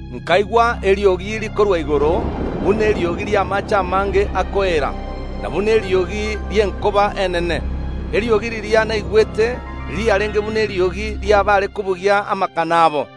Nkaigwa eriogi rikorwa igoro buna eriogi ri’amaache amange akoeera, na buna eriogi ri’enkoba enene. Eriogi riria naigwete riarenge buna eriogi ri’abaare kobugia amakano abo.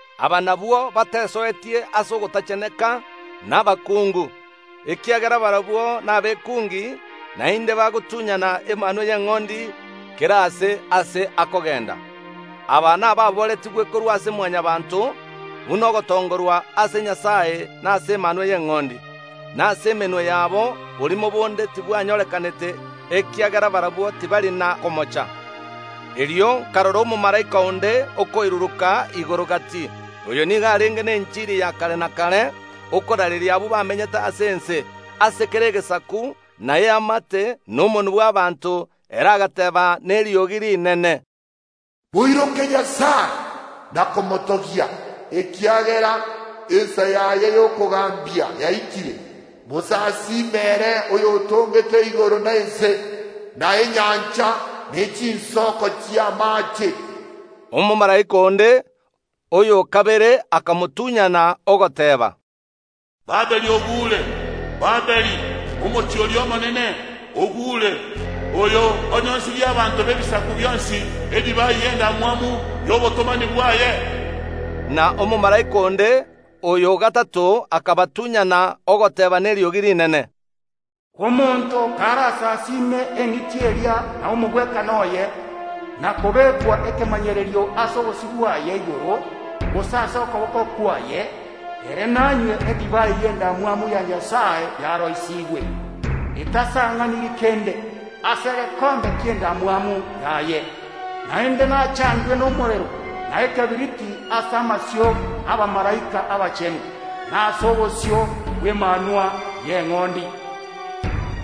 Aba nabwo batesoetie ase ogotacheneka nabakuungu, ekiagera barabwo nabekuungi, naende bagotunyana Emanwa y’Eng’ondi kera aase ase akogenda. Aba nababooretigwe korwa ase Mwanyabaanto buna ogotongorwa ase Nyasae na ase Emanwa y’Eng’ondi, na ase emenwa yabo borimo bonde tibwanyorekanete, ekiagera barabwo tibari na komocha. Erio nkarora omomalaika onde okoiruruka igoro gati. Oyo nigo arenge nenchiri ya kare na kare okoraareria abwo bamenyete ase ense, ase kera egesaku, na eamate, na omonwa, na abanto. Ere agateeba neriogi rinene, “Moiroke Nyasae na komotogia, ekiagera ensa yaye y’okogambia yaikire, mosasime ere oyotongete igoro na ense, na enyancha, ne chinsoko chi’amaache.” Omomalaika onde, oyo o kabere, akamotunyana, ogoteeba, “Babiloni ogure! Babiloni, omochie oria omonene, ogure, oyo onyoisirie abanto b’ebisaku bionsi edivai y’endamwamu y’obotomani bwaye!” Na omomalaika onde, oyo o gatato, akabatunyana, ogoteeba neriogi rinene, “Omonto karasasiime eng’iti eria na omogwekano oye, na kobekwa ekemanyererio ase obosio bwaye igoro, gose ase okoboko kwaye, ere nanywe edivai y’endamwamu ya Nyasae yaroisigwe, etasang’aniri kende, ase egekombe ki’endamwamu yaye. Naende nachandwe nomorero na ekebiriti ase amasio ’abamalaika abachenu, na ase obosio bw’Emanwa y’Eng’ondi.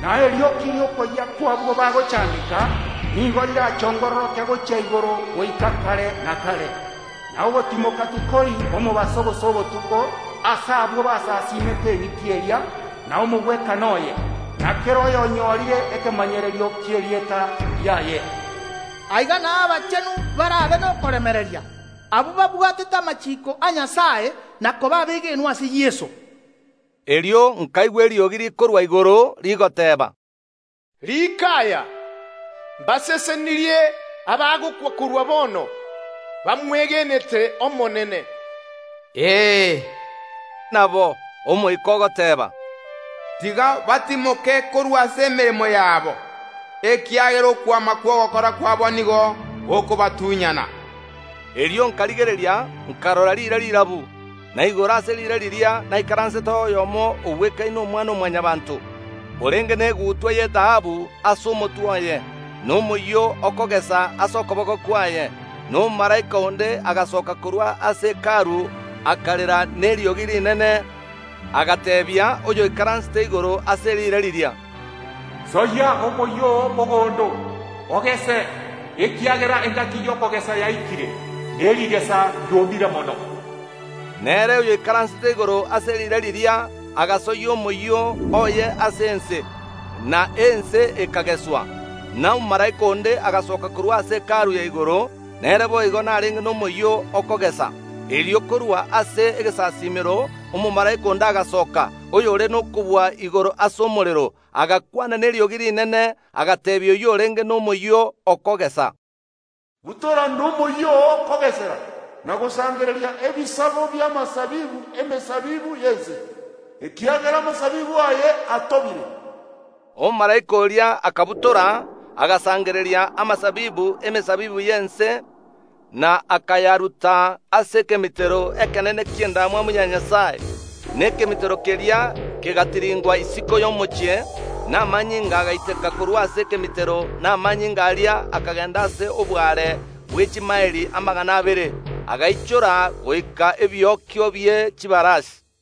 Na erioki ri’okoyia kw’abwo bagochandeka nigo rirachongororoke gochia igoro goika kare na kare. Na ogotimoka tikori omobaso gose obotuko ase abwo basasiimete eng’iti eria na omogwekano oye, na kera oyonyorire ekemanyererio ki’erieta riaye.” Aiga nao abachenu barabe nokoremereria, abwo babwatete amachiiko a Nyasae na koba abegenwa ase Yeso. Erio nkaigwa eriogi rikorwa igoro rigoteeba, “Riika aya: Mbasesenirie abagokwa korwa bono, bamwegenete Omonene. Ee, nabo, Omoika ogoteeba, tiga batimoke korwa ase emeremo yabo, ekiagera okwama kw’ogokora kwabo nigo gokobatunyana.” Erio nkarigereria, nkarora riire rirabu, na igoro ase riire riria naikaranseteo oyomo ogwekaine omwana o Mwanyabaanto, orenge negutwa y’etaabu ase omotwe oye, na omoyio okogesa ase okoboko kwaye. Na omomalaika onde agasooka korwa ase Hekalu akarera neriogi rinene, agateebia oyoikaransete igoro ase riire riria, “Soyia omoyio oo mogondo, ogese, ekiagera engaki y’okogesa yaikire, ne rigesa riomire mono.” Na ere oyoikaransete igoro ase riire riria agasoyia omoyio oye ase ense, na ense ekageswa. Na omomalaika onde agasoka korwa ase Hekalu ya igoro, nere boigo narenge nomoyio okogesa. Erio korwa ase egesasiimero omomalaika onde agasoka, oyore nokobua igoro ase omorero, agakwana neriogi rinene, agateebia oyio orenge nomoyio okogesa, “Butora nomoyio oo okogesera, na gosangereria ebisago bi’amasabibu ’emesabibu y’ense, ekiagera amasabibu aye atobire.” Omomalaika oria akabutora, agasangereria amasabibu ’emesabibu y’ense, na akayaruta ase ekemitero ekenene ki’endamwamu ya Nyasae. Na ekemitero keria kegatiringwa isiko y’omochie, na amanyinga agaiteka korwa ase ekemitero, na amanyinga aria akagenda ase oboare bwe chimaeli amagana abere, agaichora goika ebiokio bie chibarasi.